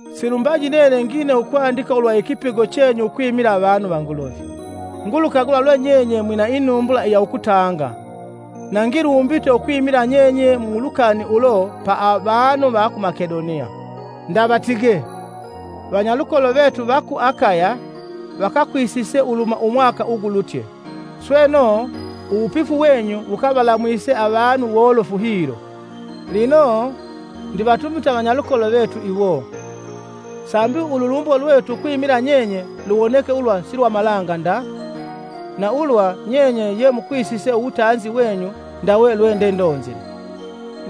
Silumbaji nene ngine ukwandika ulwa ikipigo chenyu ukwimila avanu va Nguluvi. Ngulukagula lwe nyenye mwina inumbula iya ukutanga, na ngilumbite ukwimila nyenye mu lukani ulo pa vanu va ku Makedoniya. Ndavatige, “Vanyalukolo vetu va ku Akaya vakakwisise uluhuma umwaka ugulutye.” Sweno, uwupifu wenyu wukavalamwise avanu wolofu hilo. Lino, ndivatumite vanyalukolo vetu iwo, sambi ululumbo lwetu ukwimila nyenye luwoneke ulwa si lwa malanga nda, na ulwa nyenye ye mukwisise uwutanzi wenyu ndawe lwe ndendonzile.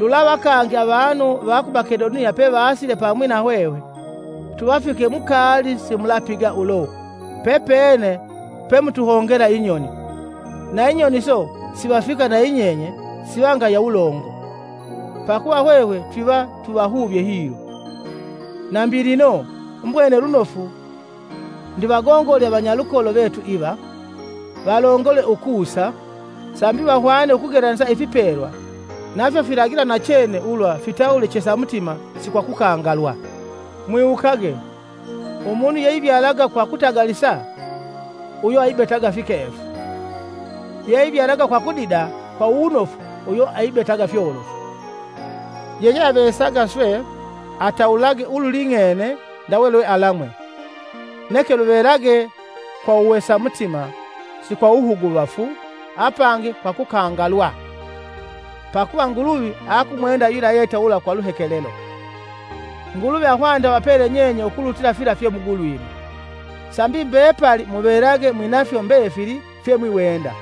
Lulava kangi avanu va ku Makendoniya pevasile pamwi na hwehwe, tuvafike mukaali simulapiga ulo, pepene pemutuhongela inyoni, na inyoni iso sivafika nayinyenye siva ngaya wulongo, pakuva hwehwe twiva tuvahuvye hilo. Nambi lino, mbwene lunofu ndivagongole avanyalukolo vetu iva, valongole ukusa, sambi vahwane ukugelanisa ifipelwa nafyo filagila nachene ulwa fitawule chesa mutima si kwa kukangalilwa. Mwiwukage, “Umunu yeivyalaga kwa kutagalisa; uyo aibetaga fikefu; yeivyalaga kwa kudida kwa wunofu uyo aibetaga fyolofu.” Yeyeavesaga swe, atawulage ululing'ene ndawe lwe alamwe, neke luvelage kwa uwesa mutima si kwa uwuhuguvafu apangi kwa kukangalilwa, pakuva Nguluvi akumwenda yula yeitawula kwa luhekelelo. Nguluvi akwilye avapele nyenye ukulutila fila fyemugulwime, sambi mbepalli muvelage mwinafyo mbefili fyemwiwenda,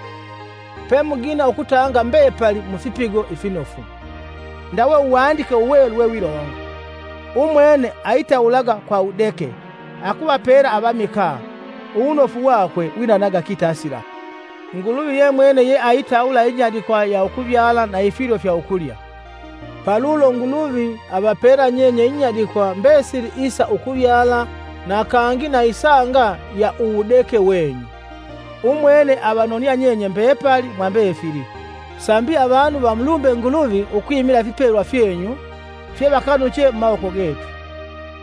pemugina ukutanga mbepali mufipigo ifinofu, ndawe Uwandike Uwelu wewilonga: “Umwene aitawulaga kwa wudeke, akuvapela avamikaa, uwunofu wakwe winanaga kitasila.” Nguluvi ye mwene yeaitawula inyadikwa ya ukuvyala na ifilyo fya ukulya, palulo Nguluvi avapela nyenye inyadikwa mbesili isa ukuvyala na kangi na isanga ya uwudeke wenyu. Umwene avanonia nyenye mbepali mwa mbefili, sambi avanu vamulumbe Nguluvi ukwimila ifipelwa fyenyu fyevakanuche mumawoko getu.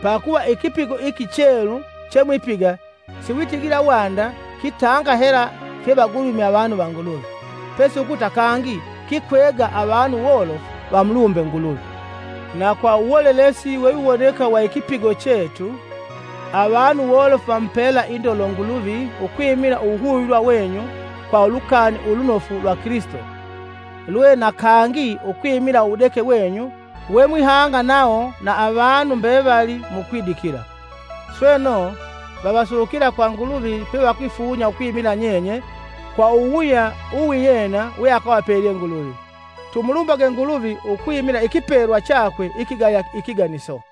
Pakuva ikipigo iki chelu chemwipiga si witigila wanda kitanga hela fyevagulwime avanu va Nguluvi, pesi ukuta kangi kikwega avanu wolofu vamulumbe Nguluvi. Na kwa uwolelesi wewiwoneka wa ikipigo chetu, avanu wolofu vamupela indolo Nguluvi ukwimila uwuhuvilwa wenyu kwa Ulukani Ulunofu lwa Kilisito lwe na kangi ukwimila uwudeke wenyu wemwihanga nawo na avanu mbevali mukwidikila. Sweno, vavasukila kwa Nguluvi pevakwifunya ukwimila nyenye kwa uwuwuya uwiyena weakavapelye Nguluvi. Tumulumbage Nguluvi ukwimila ikipelwa chakwe ikigaya ikiganiso!